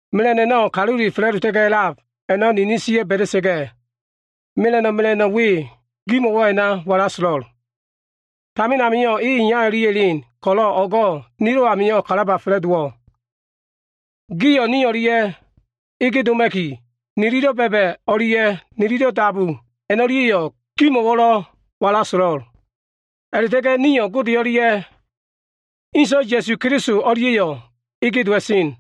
Mela꞉no꞉ a꞉no꞉ kalule fa꞉la꞉dota꞉ga꞉ a꞉lab a꞉no꞉ ninin ba꞉da꞉sa꞉ga꞉, mela꞉no꞉ mela꞉no꞉ we gimo꞉wo꞉ a꞉na walaso꞉lo꞉l. Tamin amio꞉ e iya o꞉lia꞉ elen ko꞉lo꞉, o꞉go꞉ nilo꞉ amio꞉ kalaba fa꞉la꞉dowo꞉. Gio꞉ ni o꞉lia꞉ ege doma꞉ki, nililo꞉ ba꞉ba꞉ o꞉lia꞉ nililo꞉ dabu a꞉no꞉lia꞉yo꞉ gimo꞉wo꞉lo꞉ a꞉na walaso꞉lo꞉l. A꞉la꞉ta꞉ga꞉ nio꞉ Gode o꞉lia꞉ Inso꞉, Ya꞉su Keliso o꞉lia꞉yo꞉ ege dowa꞉sen.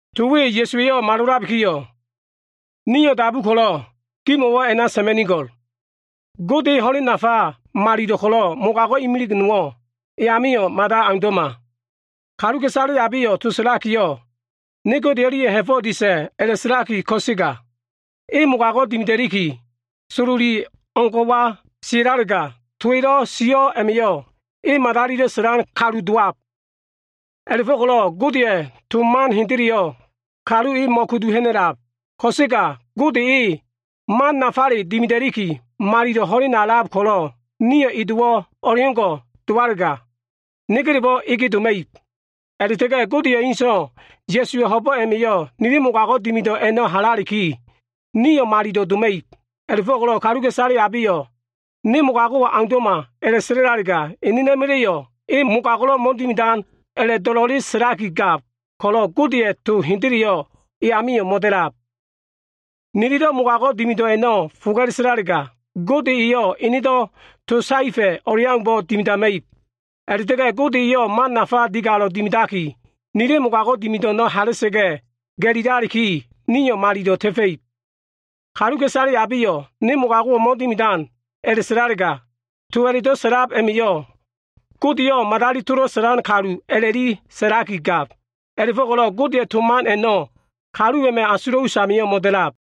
To we Ya꞉suwa꞉yo꞉ malolabikiyo꞉, nio꞉ dabu ko꞉lo꞉ gimo꞉wo꞉ a꞉na sa꞉ma꞉nigo꞉l. Gode e ho꞉len nafa malilo꞉ ko꞉lo꞉ mogago꞉ imilig nowo꞉ e amio꞉ mada aundo꞉ma. Niliyo꞉ to sa꞉lakiyo꞉, “Ne Gode o꞉lia꞉ ha꞉fo꞉wo꞉ disa꞉” a꞉la꞉sa꞉laki ko꞉sega, nio꞉ mogago꞉wo꞉ dimida꞉liki, sololi o꞉ngo꞉wa sia꞉lalega, to nililo꞉ sio꞉ a꞉ma꞉yo꞉ ninino꞉ madalilo꞉ sa꞉lan kalu dowab. A꞉la꞉fo꞉ko꞉lo꞉ Godeya꞉ to man hendeleyo꞉ niliyo꞉ mo꞉kudu ha꞉na꞉lab. Ko꞉sega Gode e, man nafale dimida꞉liki, malilo꞉ ho꞉lena a꞉lab ko꞉lo꞉, nio꞉ e dowo꞉ o꞉leo꞉ngo꞉ dowalega, negelebo꞉ ege doma꞉ib. A꞉la꞉ta꞉ga꞉ Godeya꞉ ene So꞉wa Ya꞉suwa꞉ ho꞉bo꞉ a꞉ma꞉yo꞉ nili mogago꞉ dimido꞉ a꞉no꞉ halaliki, nio꞉ malilo꞉ doma꞉ib. A꞉la꞉fo꞉ko꞉lo꞉ kaluka꞉isale abeyo꞉, “Ne mogago꞉wo꞉ aundo꞉ma” a꞉la꞉sa꞉lalega, enena꞉ma꞉la꞉yo꞉ e mogago꞉lo꞉ mo꞉dimidan a꞉la꞉do꞉lo꞉le sa꞉lakigab ko꞉lo꞉, Godeya꞉ to hendeleyo꞉ e amio꞉ mo꞉da꞉lab. Nililo꞉ mogago꞉ dimido꞉ a꞉no꞉ foga꞉le sa꞉lalega, Gode eyo꞉ enedo꞉ to saefa꞉ o꞉leaumbo꞉ dimidama꞉ib. A꞉la꞉ta꞉ga꞉ Gode eyo꞉ man nafa digalo꞉ dimidaki, nili mogago꞉ dimido꞉ a꞉no꞉ hala꞉sa꞉ga꞉ ga꞉lilaliki, nio꞉ malilo꞉ ta꞉fa꞉ib. Kaluka꞉isale abeyo꞉, “Ne mogago꞉wo꞉ mo꞉dimidan” a꞉la꞉sa꞉lalega, to a꞉la꞉do꞉ sa꞉lab a꞉ma꞉yo꞉ Godeyo꞉ madali tolo꞉ sa꞉lan kalu a꞉la꞉li sa꞉laki gab. A꞉la꞉fo꞉ko꞉lo꞉ Godeya꞉ to man a꞉no꞉ kalu a꞉ma꞉ asulo꞉ usamio꞉ mo꞉da꞉lab.